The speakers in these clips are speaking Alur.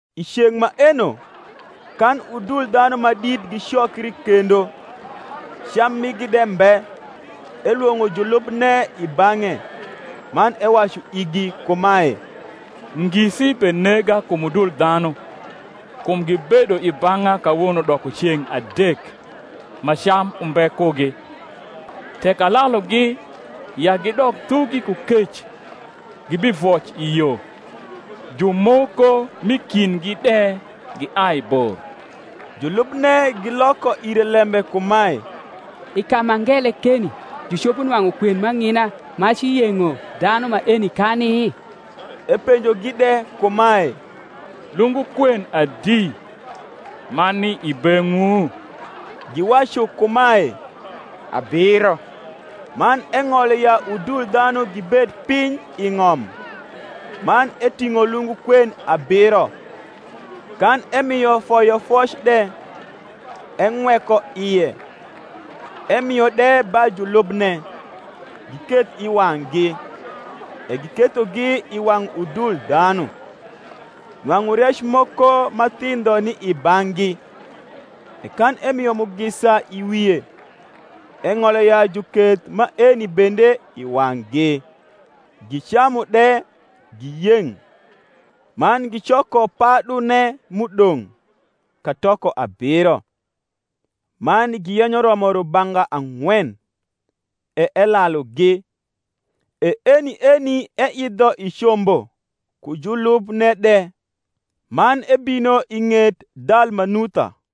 I ceng’ maeno, kan udul dhanu ma dit gicokri kendo, cam migi de mbe, elwong’o julubne i bang’e, man ewacu igi kumae, Ngisi benega kum udul dhanu, kum gibedo i bang’a kawono doko ceng’ adek, ma cam umbe kugi: tek alalugi ya gidok thugi ku kec, gibivoc i yo; jumoko m’i kindgi de giai bor. Julubne giloko ire lembe kumae, I ka ma ngele keni jucopo nwang’u kwen m’ang’ina ma ci yeng’o dhanu maeni kani? Epenjogi de kumae, Lungu kwen adi ma ni i beng’wu? Giwacu kumae, Abiro. Man eng’olo ya udul dhanu gibed piny i ng’om: man eting’o lungu kwen abiro, kan emio foyofoc de, eng’weko ie, emio de ba julubne, giketh i wang’gi: e gikethogi i wang’ udul dhanu. Nwang’u rec moko ma thindho ni i bang’gi: e kan emio mugisa i wie, eng’olo ya juketh maeni bende i wang’gi. Gicamu de, giyeng’: man gicoko padune m’udong’, katoko abiro. Man giyenyo romo rubanga ang’wen: e elalugi. E eni eni eidho i combo ku iulubne de. man ebino i ng’et Dalmanu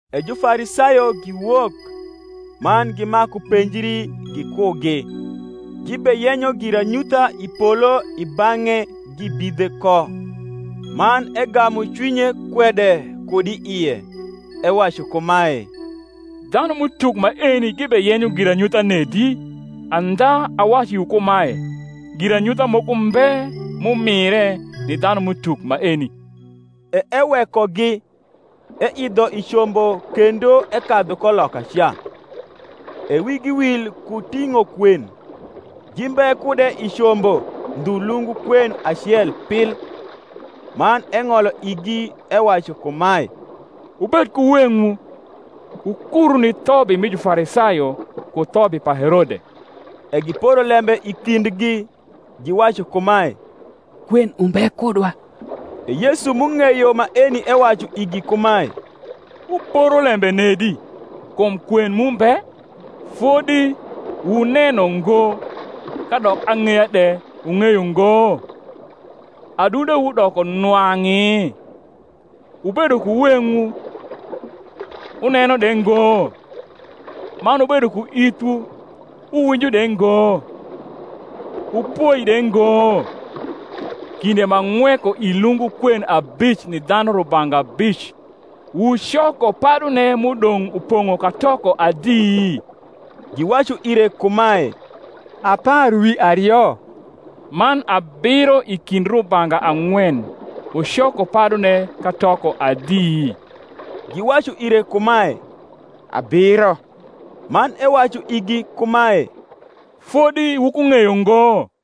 E Jufarisayo giwok, man gimaku penjri gikugi, gibeyenyo giranyutha i polo i bang’e gibidhe ko. Man egamu cwinye kwede kud i ie, ewacu kumae, Dhanum’utuk maeni gibeyenyo giranyutha nedi? andha awacu iwu kumae, Giranyutha moko mbe m’umire ni dhanum’utuk maeni. E ewekogi, eidho i combo kendo ekadhu ko lokaca. E wigi wil ku ting’o kwen; gimbe kude i combo ndhu lungu kwen acel pil. Man eng’olo igi, ewacu kumae, Wubed ku weng’wu, wukuru ni thobi mi Jufarisayo ku thobi pa Herode. E giporo lembe i kindgi, giwacu kumae, Kwen umbe kudwa. E Yesu m’ung’eyo maeni ewacu igi kumae, Wuporo lembe nedi, kum kwen mu mbe? fodi wuneno ngo, kadok ang’eya de wung’eyo ngo? adundewu doko nwang’i? Wubedo ku weng’wu, wuneno de ngo? man wubedo ku ithwu, wuwinjo de ngo? wupoi de ngo? Kinde m’ang’weko i lungu kwen abic ni dhanu rubanga abic, wucoko padune m’udong’ upong’o katoko adi? Giwacu ire kumae, Apar wi ario. Man abiro i kind rubanga ang’wen, wucoko padune katoko adi? Giwacu ire kumae, Abiro. Man ewacu igi kumae, Fodi wukung’eyo ngo?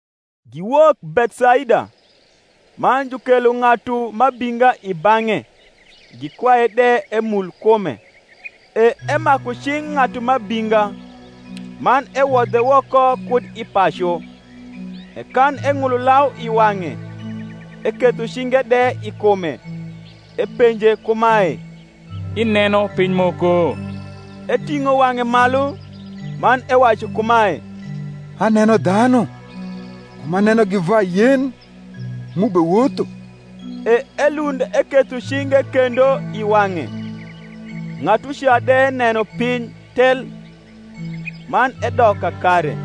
Giwok Bethsaida. Man jukelo ng’atu m’abinga i bang’e, gikwaye de emul kume. E emaku cing’ ng’atu m’abinga, man ewodhe woko kud i pacu; e kan eng’ulo lau i wang’e, eketho cinge de i kume, epenje kumae, Ineno piny moko? Eting’o wang’e malu, man ewacu kumae, Aneno dhanu; kum anenogi va yen, m’ubewotho. E elund eketho cinge kendo i wang’e; ng’atuca de neno piny tel, man edok kakare,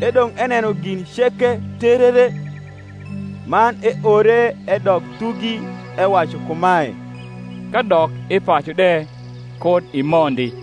edong’ eneno gin ceke terere. Man eore edok thugi, ewacu kumae, Kadok i pacu de kud imondi.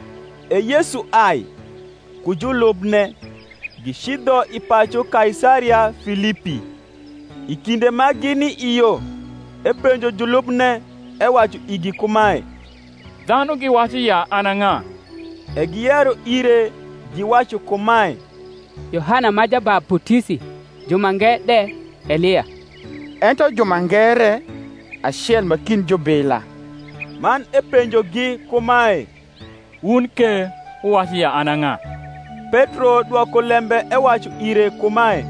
E Yesu ai, ku julubne, gicidho i pacu Kaisaria Filipi: i kinde ma gini i yo epenjo julubne, ewacu igi kumae, Dhanu giwacu ya an a ng’a? E giyero ire, giwacu kumae, Yohana ma Jabaputisi; jumange de, Elia; ento jumange re, Acel ma kind jubila. Man epenjogi kumae, Wun ke wuwacu ya an a ng’a? Petro dwoko lembe ewacu ire kumae,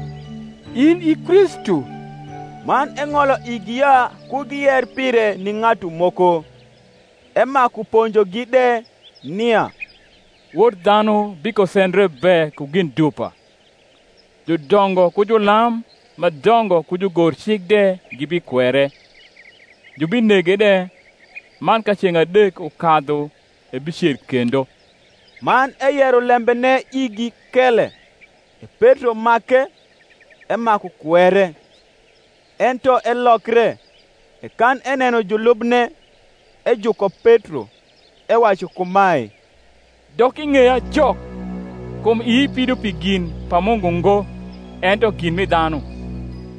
In i Kristu. Man eng’olo igi ya ku giyer pire ni ng’atu moko. Emaku ponjogi de, nia Wod dhanu bikosendre be ku gin dupa, judongo ku julam ma dongo ku jugorcik de gibikwere, jubinege de, man ka ceng’ adek ukadhu ebicer kendo. Man eyero lembene igi kele. E Petro make, emaku kwere. Ento elokre, e kan eneno julubne, ejuko Petro, ewacu kumae, Dok i ng’eya Jok; kum ii pido pi gin pa Mungu ngo, ento gin mi dhanu.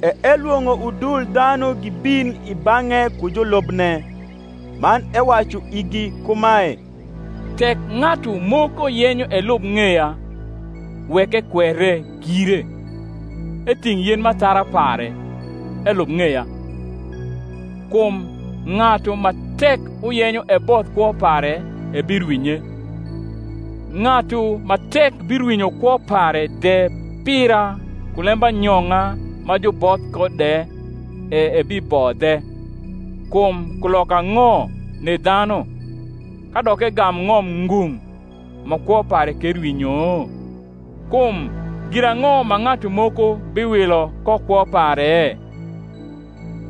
E elwong’o udul dhanu gibin i bang’e ku julubne, man ewacu igi kumae, Tek ng’atu moko yenyo elub ng’eya, wek ekwere gire, eting’ yen m’athara pare, elub ng’eya. Kum ng’atu ma tek uyenyo ebodh kwo pare ebirwinye; ng’atu ma tek birwinyo kwo pare de pira ku lembanyong’a ma juboth ko de e ebibodhe. Kum kuloka ang’o ni dhanu, kadok egam ng’om ngung’, ma kwo pare ke rwinyo? Kum girang’o ma ng’atu moko biwilo ko kwo pare?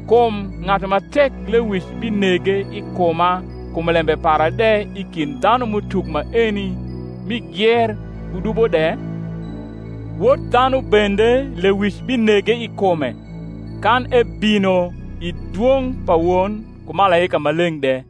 Kum ng’atu ma tek lewic binege i kuma kum lembe para de i kind dhanum’utuk maeni mi gier ku dubo de, Wod dhanu bende lewic binege i kume, kan ebino i dwong’ pa Won ku malaika maleng’ de.